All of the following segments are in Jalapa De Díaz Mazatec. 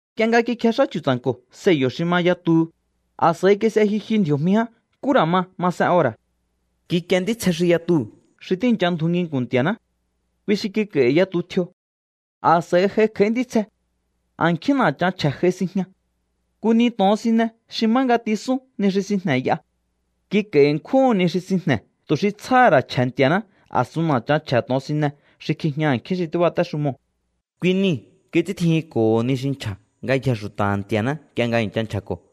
Nk'ie nga kikjex'á Chu̱tsa̱nko̱ sello̱ xi ma yatuhu, a̱s'a̱i kis'e jyu jyu ndji̱o̱jmi ján nkú ra̱ ma masen ora̱. Kikie ntítsje xi yatuu̱ xi tíi̱ncha ndju nginku̱n Nti̱a̱ná. Kui xi kik'a̱i̱hi̱ yatu tjio. A̱s'a̱i j'ai kj'a̱í ntítsje. A̱nkjín na̱chan chje̱ j'ai sinjña. Nku ni to̱onsine xi má nga tisún ni xi sinjne̱ y'a. Kik'a̱i̱ ṉkjúhu̱n ni xi sinjne̱ tu̱ xi tsjáha̱ ra̱ chje̱ Nti̱a̱ná a̱sun na̱chan chje̱ to̱onsine xi kjijña a̱nkjín xi tíbatéxumoo̱. Kui niu̱ kits'íntjijinko̱ho ni xi nchja̱ ngayjee̱ xu̱ta̱ha̱ Nti̱a̱ná nk'ie nga i̱ncha nchja̱ko̱.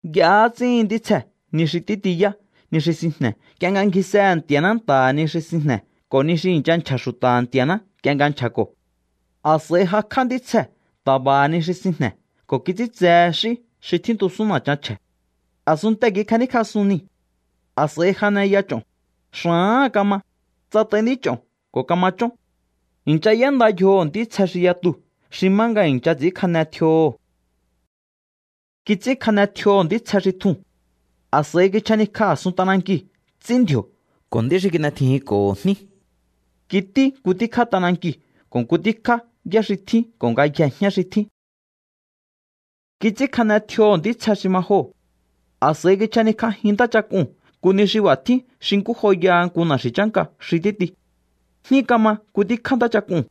Y'ahá ts'íhin ntítsjee̱ ni xi títiyá ni xi sinjne̱ nk'ie nga ngjisehe̱ Nti̱a̱ná nta̱ha̱ ni xi sinjne̱ ko̱ ni xi i̱ncha nchja̱ xu̱ta̱ha̱ Nti̱a̱ná nk'ie nga nchja̱ko̱. A̱s'a̱i jakj'á ntítsjee̱ ta̱ba̱ha̱ ni xi sinjne̱ ko̱ kits'íntsehe x'í xi tjíntusún na̱chan chje̱. A̱sunntee̱ kikjaníkj'asún niu̱. A̱s'a̱i janeya ch'o̱n, xa̱áha̱n kama, tsat'ai nd'ích'o̱n ko̱ kama chón. I̱ncha y'énda yjoho̱ ntítsje xi yatuu̱ xi má nga i̱ncha ts'i̱ínkjane tjioho̱. Kits'ínkjane tjioho̱ ntítsje xi tjuu̱n. A̱s'a̱i kichjanikj'a a̱sun t'anankiu̱ ts'í ndji̱o̱ ko̱ nd'í xi kin'etjijinko̱ho jní. Kití nku tíkjá t'anankiu̱ ko̱ nku tíkjá yá xi tjín ko̱ ngayjee̱ jñá xi tjín. Kits'ínkjane tjioho̱ ntítsje xi ma joo̱. A̱s'a̱i kichjanikj'ajin ntáchak'uu̱n nku ni xi b'a̱ tjín xi nkú joyaha nku na̱xi̱ chánka xi títi. Jní kama nku tíkjá ntáchak'uu̱n.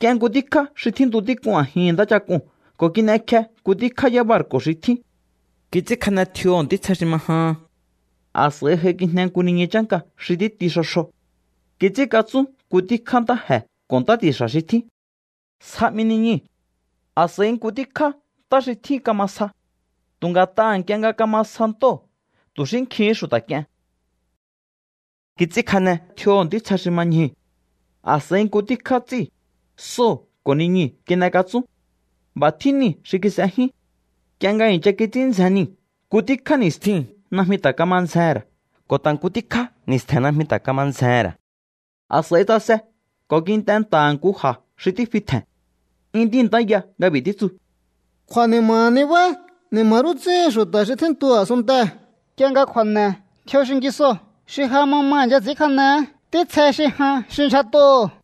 K'ien nku tíkjá xi tjíntu tík'un a̱jin ntáchak'uu̱n ko̱ kin'ekje nku tíkjá yábarku̱ xi tjín. Kits'ínkjane tjioho̱ ntítsje xi ma jaa̱n. A̱s'a̱i j'aikijne nku niñu chánka xi títi xjo xjo. Kits'ínkatsún nku tíkjá ntáje̱ ko̱ ntá ti̱xa̱ xi tjín. Sja 'mi niñuu̱. A̱s'a̱i nku tjíkjá ntá xi tjín kama sja. Tu̱ nga̱t'aha̱ nk'ie nga kama sja ntóo̱ tu̱ xi nkjíhín xu̱ta̱ k'ien. Kits'ínkjane tjioho̱ ntítsje xi ma ñjuu̱. A̱s'a̱i nku tíkjá ts'íu̱, sóo̱ ko̱ niñuu̱ kin'ekatsún. B'a̱ tjín niu̱ xi kis'ejyún. Nk'ie nga i̱ncha kits'ín ndzjen niu̱ nku tjíkjá ni̱stjiu̱n najmi ta̱ kama ndzjehe̱n ra̱ ko̱ ta̱ nku tjíkjá ni̱stje̱n najmi ta̱ kama ndzjehe̱n ra̱. A̱s'a̱i tsase ko̱ kint'e nta̱ha̱ nku ja̱ xi tífi tje̱n. 'Yún tíintáya nga b'i̱ títsu: —¡Kju̱a̱ni̱ma̱ nibá! ¡Ni̱ma̱ rú ts'íhin xu̱ta̱ xi tjíntu a̱sunntee̱ nk'ie nga kju̱a̱ne̱ tjio xingisoo̱ xi ja ma ma i̱ncha ts'i̱ínkjanehé ntítsje xi jan xi ndyjat'óo̱!